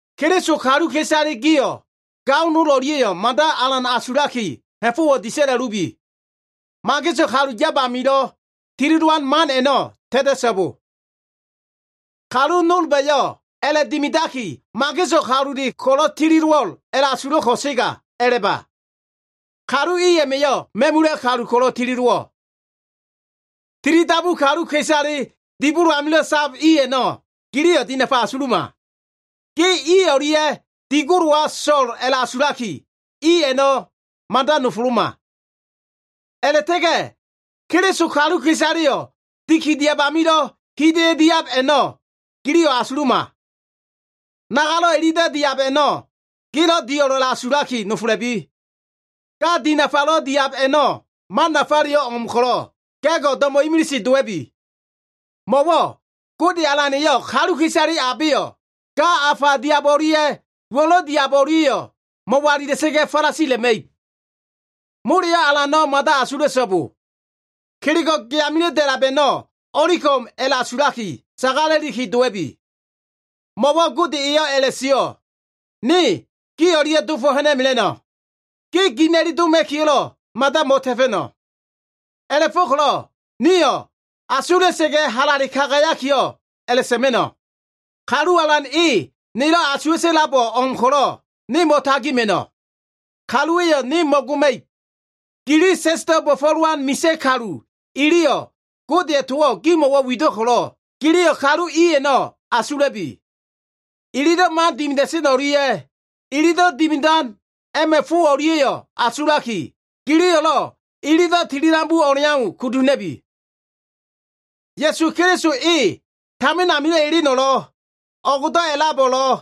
Keliso kaluka꞉isale gio꞉ gao nol o꞉lia꞉yo꞉ mada alan asulaki ha꞉fo꞉wo꞉ disa꞉la꞉lubi. Mageso꞉ kalu yab amilo꞉ tili dowan man a꞉no꞉ ta꞉ta꞉so꞉bo. Kalu nolba꞉yo꞉ a꞉la꞉dimidaki, mageso꞉ kalule ko꞉lo꞉ tili dowo꞉l a꞉la꞉asulo꞉ ko꞉sega a꞉la꞉ba. Kalu i a꞉ma꞉yo꞉ ma꞉mula꞉ kalu ko꞉lo꞉ tili dowo꞉. Tilidabu kaluka꞉isale dibolo amilo꞉ sab i a꞉no꞉, giliyo꞉ dinafa asuluma. Ge i o꞉lia꞉ dibolowa so꞉l a꞉la꞉asulaki, i a꞉no꞉ mada nofoloma. A꞉la꞉ta꞉ga꞉ Keliso kaluka꞉isaleyo꞉ dikidiab amilo꞉ hida꞉yo꞉ diab a꞉no꞉ giliyo꞉ asuluma. Nagalo꞉ ililo꞉ diab a꞉no꞉ gelo꞉ dio꞉l a꞉la꞉asulaki nofola꞉bi. Ga dinafalo꞉ diab a꞉no꞉ man nafaleyo꞉ o꞉m ko꞉lo꞉, ga꞉go꞉ do꞉mo꞉ imilise dowa꞉bi. Mo꞉wo꞉ Gode alan eyo꞉ kaluka꞉isale abeyo꞉ ga afa diab o꞉lia꞉, uwo꞉lo꞉ diab o꞉lia꞉yo꞉, mo꞉walila꞉sa꞉ga꞉ falasila꞉ma꞉ib. Moleyo꞉ alano꞉ mada asula꞉so꞉bo. Kelego꞉ ge amilo꞉ da꞉lab a꞉no꞉ o꞉li ko꞉m a꞉la꞉asulaki sagala꞉liki, dowa꞉bi. Mo꞉wo꞉ Gode eyo꞉ a꞉la꞉sio꞉, “Ne gi o꞉lia꞉ dofo꞉ ha꞉na꞉mela꞉no꞉. Ge gina꞉li doma꞉kiyo꞉lo꞉, mada mo꞉ta꞉fa꞉no꞉.” A꞉la꞉fo꞉ko꞉lo꞉ nio꞉ asula꞉sa꞉ga꞉ halale kagayakiyo꞉ a꞉la꞉sa꞉ma꞉no꞉, “Kalu Alan e, nelo꞉ asuwa꞉ta꞉labo꞉ o꞉m ko꞉lo꞉, ne mo꞉tagima꞉no꞉. Kaluwa꞉yo꞉ ne mo꞉goma꞉ib.” Gili sa꞉sdo꞉ bo꞉fo꞉lowan misa꞉ kalu iliyo꞉ Godeya꞉ towo꞉ gimo꞉ wido꞉ ko꞉lo꞉, giliyo꞉ kalu i a꞉no꞉ asula꞉bi. Ililo꞉ man dimida꞉sen o꞉lia꞉, ililo꞉ dimidan a꞉ma꞉ fo a꞉no꞉lia꞉yo꞉ asulaki, giliyo꞉lo꞉ ililo꞉ tilidabu o꞉leau kudu ha꞉na꞉bi. Ya꞉su Keliso e tamin amio꞉ eleno꞉lo꞉, o꞉go꞉do꞉ a꞉labo꞉lo꞉,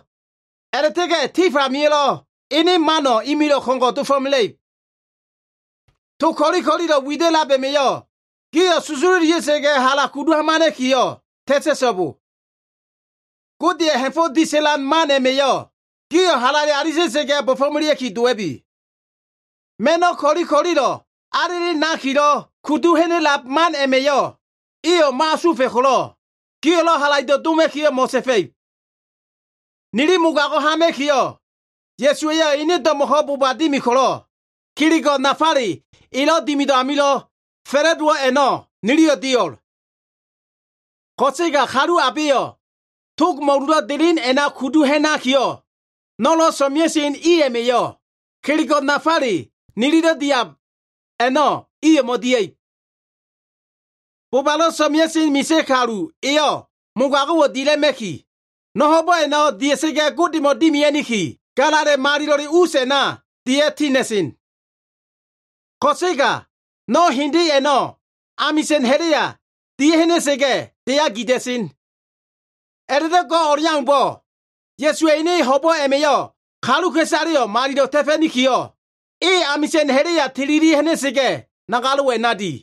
a꞉la꞉ta꞉ga꞉ tif amio꞉lo꞉ ene mano꞉ imilo꞉ ko꞉ngo꞉ dofo꞉mela꞉ib. To ko꞉li ko꞉lilo꞉ wida꞉lab a꞉ma꞉yo꞉ gio꞉ susululia꞉ga꞉ hala kudu hamana꞉kiyo꞉ ta꞉ta꞉so꞉bo. Godeya꞉ ha꞉fo꞉ disa꞉lan man a꞉ma꞉yo꞉ gio꞉ halale alita꞉sa꞉ga꞉ bo꞉fo꞉melea꞉ki dowa꞉bi. Ma꞉no꞉ ko꞉li ko꞉lilo꞉ alele nakilo꞉ kudu ha꞉na꞉lab man a꞉ma꞉yo꞉ iyo꞉ mo꞉asufa꞉ ko꞉lo꞉, gio꞉lo꞉ halaido꞉ doma꞉kiyo꞉ mo꞉ta꞉fa꞉ib. Nili mogago꞉ hama꞉kiyo꞉, Ya꞉suwa꞉yo꞉ ene do꞉mo꞉ko꞉ boba dimi ko꞉lo꞉, kelego꞉ nafale elo꞉ dimido꞉ amilo꞉ fa꞉la꞉dowo꞉ a꞉no꞉ niliyo꞉ dio꞉l. Ko꞉sega kalu abeyo꞉ tog mo꞉lulo꞉ delen a꞉na kudu ha꞉nakiyo꞉ no꞉lo꞉ so꞉mea꞉sen i a꞉ma꞉yo꞉, kelego꞉ nafale nililo꞉ diab a꞉no꞉ iyo꞉ mo꞉dia꞉ib. Bobalo꞉ so꞉mea꞉sen misa꞉ kalu eyo꞉ mogago꞉wo꞉ dila꞉ma꞉ki, no꞉ ho꞉bo꞉ a꞉no꞉ dia꞉sa꞉ga꞉ Godemo꞉ dimia꞉niki, Galala꞉ Malilo꞉le us a꞉na dia꞉ tina꞉sen. Ko꞉sega no꞉ hende a꞉no꞉ amisa꞉n ha꞉la꞉ya dia꞉ha꞉na꞉sa꞉ga꞉, deya gida꞉sen. A꞉la꞉do꞉ go꞉ o꞉leaumbo꞉, Ya꞉suwa꞉ ene ho꞉bo꞉ a꞉ma꞉yo꞉ kaluka꞉isaleyo꞉ malilo꞉ ta꞉fa꞉nikiyo꞉, e amisa꞉n ha꞉la꞉ya tilili ha꞉na꞉sa꞉ga꞉, nagalo꞉wo꞉ a꞉na di.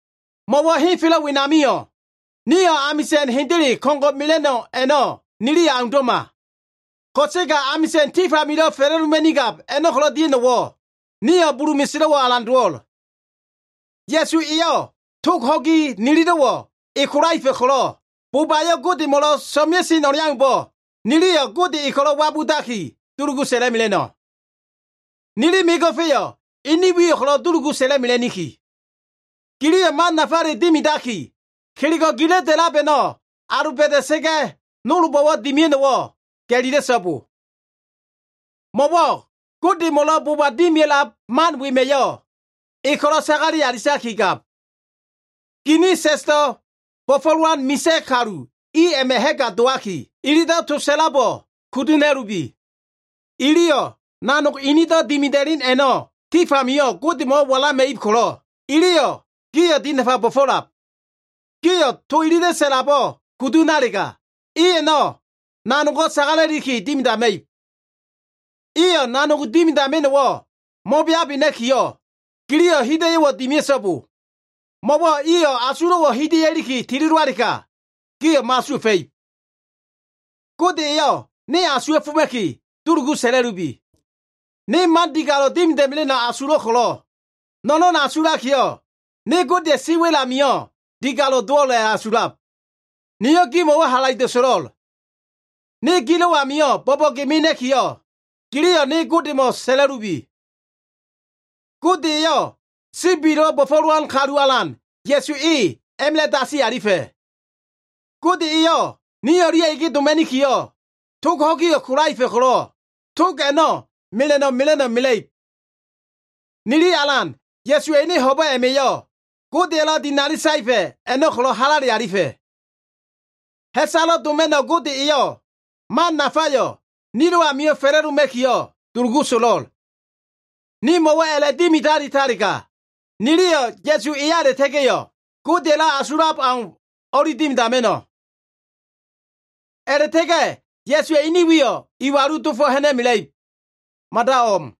Mo꞉wo꞉ henfelo꞉ wenamio꞉, nio꞉ amisa꞉n hendele ko꞉ngo꞉ mela꞉no꞉ a꞉no꞉ niliyo꞉ aundo꞉ma. Ko꞉sega amisa꞉n tif amilo꞉ fa꞉la꞉doma꞉nigab a꞉no꞉ ko꞉lo꞉ dia꞉no꞉wo꞉, nio꞉ bulu meselo꞉wo꞉ alan dowo꞉l. Ya꞉su eyo꞉ tog ho꞉gi nililo꞉wo꞉ e kolaefa꞉ ko꞉lo꞉, bobayo꞉ Godemo꞉lo꞉ so꞉mea꞉sen o꞉leaumbo꞉, niliyo꞉ Gode e ko꞉lo꞉ wabudaki dulugu sa꞉la꞉mela꞉no꞉. Nili mego꞉fa꞉yo꞉ ene wiyo꞉ ko꞉lo꞉ dulugu sa꞉la꞉mela꞉niki. Giliyo꞉ man nafale dimidaki, kelego꞉ gilo꞉ da꞉lab a꞉no꞉ aloba꞉da꞉sa꞉ga꞉ nolbo꞉lo꞉ dimia꞉no꞉wo꞉ ga꞉lila꞉so꞉bo. Mo꞉wo꞉ Godemo꞉lo꞉ boba dimia꞉lab man wema꞉yo꞉ E ko꞉lo꞉ sagale alitakigab. Ginin sa꞉sdo꞉ bo꞉fo꞉lowan misa꞉ kalu i a꞉ma꞉ ha꞉ga dowaki, ililo꞉ to sa꞉labo꞉ kudu ha꞉na꞉lubi. Iliyo꞉ nanog inido꞉ dimida꞉len a꞉no꞉ tif amio꞉ Godemo꞉wo꞉ walama꞉ib ko꞉lo꞉, iliyo꞉ gio꞉ dinafa bo꞉fo꞉lab. Gio꞉ to ililo꞉ sa꞉labo꞉ kudu ha꞉nalega, i a꞉no꞉ nanogo꞉ sagala꞉liki dimidama꞉ib. Iyo꞉ nanog dimidama꞉no꞉wo꞉ mo꞉beabena꞉kiyo꞉, giliyo꞉ hida꞉yo꞉wo꞉ dimia꞉so꞉bo. Mo꞉wo꞉ iyo꞉ asulo꞉wo꞉ hida꞉ya꞉liki tilidowalega, gio꞉ mo꞉asuwa꞉fa꞉ib. Gode eyo꞉ ne asuwa꞉foma꞉ki, dulugu sa꞉la꞉lubi. Ne man digalo꞉ dimida꞉mela꞉no꞉ asulo꞉l ko꞉lo꞉, no꞉no꞉n asulakiyo꞉, ne Godeya꞉ siwa꞉l amio꞉ digalo꞉ dowo꞉l a꞉la꞉asulab. Niyo꞉ gimo꞉wo꞉ halaido꞉ so꞉lo꞉l. Ne gilo꞉ amio꞉ bo꞉bo꞉ge mena꞉kiyo꞉, giliyo꞉ ne Godemo꞉ sa꞉la꞉lubi. Gode eyo꞉ sibilo꞉ bo꞉fo꞉lowan kalu alan Ya꞉su e a꞉ma꞉la꞉ dasi alifa꞉. Gode eyo꞉ ni o꞉lia꞉ ege doma꞉niki, tog ho꞉giyo꞉ kolaefa꞉ ko꞉lo꞉, tog a꞉no꞉ mela꞉no꞉ mela꞉no꞉ mela꞉ib. Nili Alan Ya꞉suwa꞉ ene ho꞉bo꞉ a꞉ma꞉yo꞉ Godeya꞉lo꞉ dinali saefa꞉ a꞉no꞉ ko꞉lo꞉ halale alifa꞉. Ha꞉salo꞉ doma꞉no꞉ Gode eyo꞉ man nafayo꞉ nilo꞉ amio꞉ fa꞉la꞉doma꞉kiyo꞉ dulugu so꞉lo꞉l. Nimo꞉wo꞉ a꞉la꞉dimidalitalega, niliyo꞉ Ya꞉su eya a꞉la꞉ta꞉ga꞉yo꞉ Godeya꞉lo꞉ asulab aumbo꞉ o꞉li dimidama꞉no꞉. A꞉la꞉ta꞉ga꞉ Ya꞉suwa꞉ ene wiyo꞉ iwalule dofo꞉ ha꞉na꞉mela꞉ib. Mada o꞉m.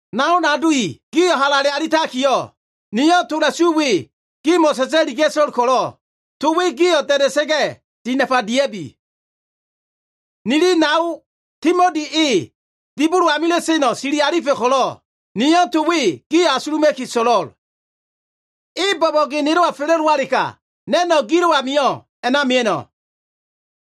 Nao nado i, gio꞉ halale alitakiyo꞉, niyo꞉ tola꞉su we gimo꞉ sa꞉sa꞉liga꞉to꞉l ko꞉lo꞉, to we gio꞉ da꞉da꞉sa꞉ga꞉ dinafa dia꞉bi. Nili nao Timoti e dibolo amilo꞉ seno꞉ sili alifa꞉ ko꞉lo꞉, niyo꞉ to we gio꞉ asuluma꞉ki so꞉lo꞉l. E bo꞉bo꞉ge nelo꞉wa fa꞉la꞉dowalega, na꞉no꞉ gilo꞉ amio꞉ a꞉na mia꞉no꞉.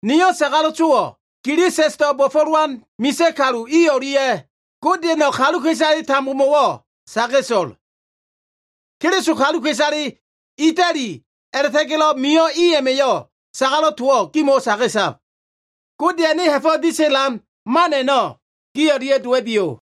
Niyo꞉ sagalo꞉ towo꞉ gili sa꞉sdo꞉ bo꞉fo꞉lowan misa꞉ kalu i o꞉lia꞉ Godeya꞉no꞉ kaluka꞉isale tambomo꞉wo꞉ saga꞉to꞉l. Keliso kaluka꞉isale Itali a꞉la꞉ta꞉ga꞉lo꞉ mio꞉ i a꞉ma꞉yo꞉lo꞉ sagalo꞉ towo꞉ gimo꞉wo꞉ saga꞉tab. Godeya꞉ ene ha꞉fo꞉ disa꞉lan man a꞉no꞉ gi o꞉lia꞉ dowa꞉biyo꞉.